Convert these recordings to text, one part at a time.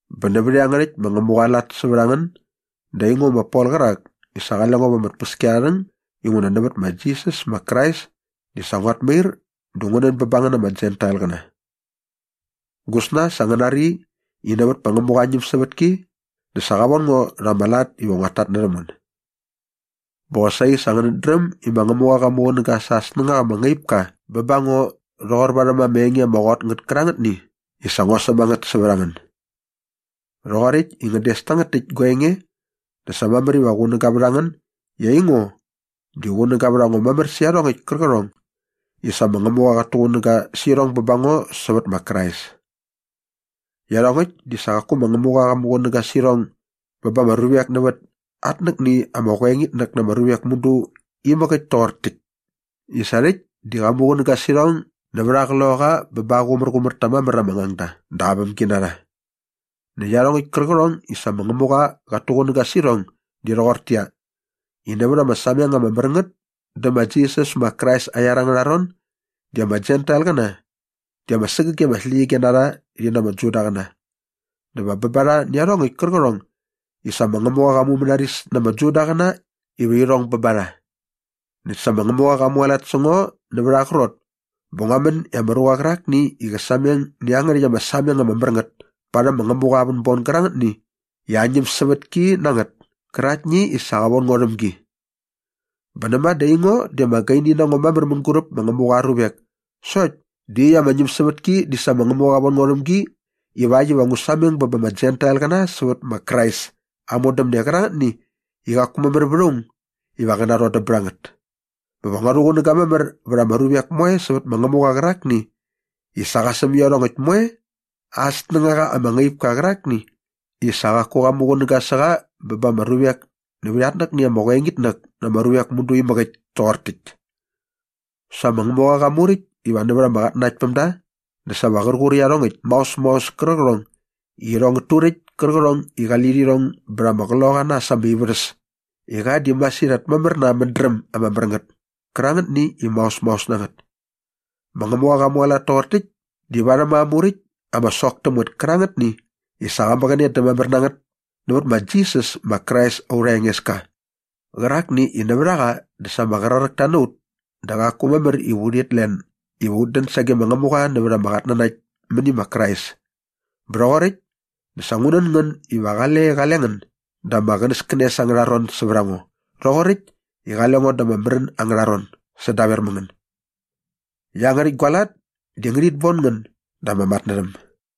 Bä nävät iangärhäkt ma Ngämuqa aa lat sävät a ngän dä aingo ma Pol qärak i sa qale ngo va ama tpäskiarharhäng inguna nävät ma Jisas ma Krais di sa nguat mair dä ngu nän bä bä ngän ama Jentailqäna. Gusna sa ngän nari i nävät ma Ngämuqa aa ñämsävätki dä sa qa von ngo rha ama lat iva nguat tatnärhäm ngän. Bä qosaqi sa ngänät dräm i ma Ngämuqa qa muqunäga sa aa snängaqa ama ngaip ka bä ba ngo rhoqor varhäm ama enge ama qot ngät kärangätni i sa ngua säm a ngät sävät a ngän. Rhoqoräkt i ngän des tangät täkt gua enge dä sa mamär iva qunäga vät ngän i aingo di qunäga vät a ngo mamär sä iarhongäkt kärqärhong i sa ma Ngämuqa qat tuqunäga sä irhong bä ba ngo sävät ma Krais. Iarhongäkt di sa qaku ma Ngämuqa qa muqunäga sä irhong bä ba ama ruvek nävät atnäkni ama qoengitnäk na ama ruvek mudu inamäk toqor täkt i sa rhäkt di qa muqunäga sä irhong nävät aa Qloqaqa bä ba aa qumärqumär ta mamär ama ngangda dä aa vämginarha. Näkt iarhongäkt kärqärhong i sa ma Ngämuqa qat tuqunäga sä irhong di rhoqortäqyia, i nävät ama sameng ama mär ngät dä ma Jisas ma Krais aa iar angärha ron di ama Jentailqäna di ama sägäge ama släqyige na rha rhi na ama Judaqäna dä va bä ba rha nä iarhongäkt kärqärhong i sa ma Ngämuqa qa mumänaris na ama Judaqäna iva irhong bä ba rha. Näkt sa ma Ngämuqa qa mualat sä ngo nävät aa qrot bä ngua män i ama ruqa qärakni i qä sameng nä iangärhäkt ama sameng ama mär ngät parhäm ma Ngämuqa aa vänbon gärangätni i aa ñämsävätki na ngät käraktni i sa qa von ngo rhäm gi. Bä näma dä aingo di ama gaini na ngo mamär mänguräp ma Ngämuqa aa ruvek sokt di iaqyäkt ama ñämsävätki di sa ma Ngämuqa qa von ngo rhäm gi ivakt iva ngu sameng bä ba ama Jentailqäna sävät ma Krais aa modämne qärangätni i qaku mamär vät aung iva qä narhodäm bät a ngät bä va ngua rhuqunäga mamär vät ama ruvek moe sävät ma Ngämuqa qärakni i sa qa säm iarhongäkt moe aa snängaqa ama ngaip ka qärakni i sa qaku qa muqunäga sä qa bä ba ama ruvek nävät atnäkni ama qoengitnäk na ama ruvek mudu inamäk toqor täkt. Sa ma Ngämuqa qa muräkt iva nävät ama qatnanaktpämda dä sa va qär qur iarhongäkt maos maos kärqärhong i irhong ngät turäkt kärqärhong i qali lirhong bät ama qloqaqa na äs ama ivärhäs i qa di masirhat mamär na aa mädräm ama mär ngät kärangätni i maos maos na ngät. Ma Ngämuqa qa mualat toqor täkt di varhäm aa muräkt ama sok täm ngät kärangätni i sa qa mäqäne dä mamär na ngät nävät ma Jisas ma Krais aurha Engeska qärakni i nävät a qa dä sa ama qraräkta na ut dä qaku mamär iva urhit len iva ut dän sage ma Ngämuqa nävät ama qatnanakt mäni ma Krais. Bä rhoqoräkt dä sa ngu nän ngän iva qale qale ngän da ama qänäskänes angärha ron sävät a ngo rhoqoräkt i qale ngo da ama märän angärha ron sädaver mä ngän. Iangärhäkt gua lat di ngärhit bon ngän da ama matnärhäm.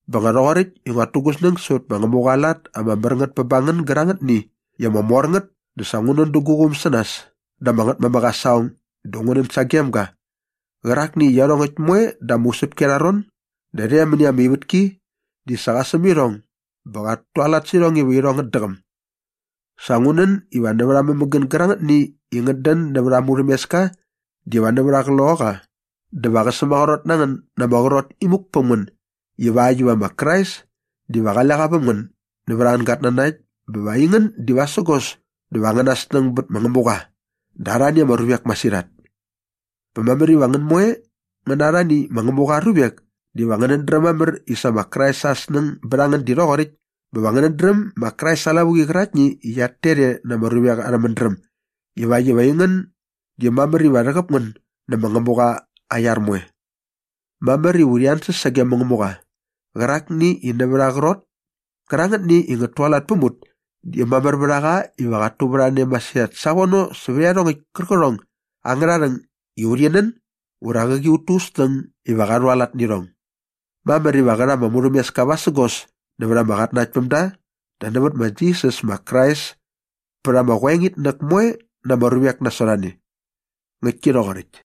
Bä nga rhoqoräkt i nguat tu gu snäng sävät ma Ngämuqa aa lat ama mär ngät bä ba ngän gärangätni i ama mor ngät dä sa ngu nän dä gu quum sä nas dä ama Ngätmamäk aa saqong dä ngu nän sagem ga qärakni i iarhongäkt moe da ama usäpki arha ron dä rhe mäni ama ivätki di sa qa säm irhong bä qat tualat sä irhong iva irhong ngät däqäm. Sa ngu nän iva nävät aa mämägän gärangätni i ngät dän nävät aa murhämeska diva nävät aa Qloqaqa dä va qä sämaqrot na ngän na ama qrot imuk päm ngän ivakt iva ma Krais diva qale qa väm ngän nävät angän gatnanakt bä va aingän di vasägos dä va angäna snäng bät ma Ngämuqa dä arhani ama ruvek masirhat. Bä mamär iva ngän moe ngän na arhani ma Ngämuqa aa ruvek diva ngänät dräm mamär i sa ma Krais aa snäng bät a ngän di rhoqoräkt bä va ngänät dräm ma Krais aa lavuqi qäraktni qiat tet e na ama ruvek arhä mädräm ivakt iva aingän di mamär iva rhäqäp ngän nä ma Ngämuqa aa iar moe. Mamär iva urhi ansäs sage ma Ngämuqa qärakni i nävät aa qrot kärangätni i ngät tualat päm ut di mamär vät a qa iva qat tuvärhane masirhat savono sävät iarhongäkt kärqärhong angärha rhäng i urhi nän ura qäqi ut tu ut snäng iva qa rhualat nä irhong. Mamär iva qä rha ama murhämeska vasägos nävät ama qatnanaktpämda dä nävät ma Jisas ma Krais pät ama qoengitnäk moe na ama ruvek nasot a ne. Ngäktki rhoqoräkt.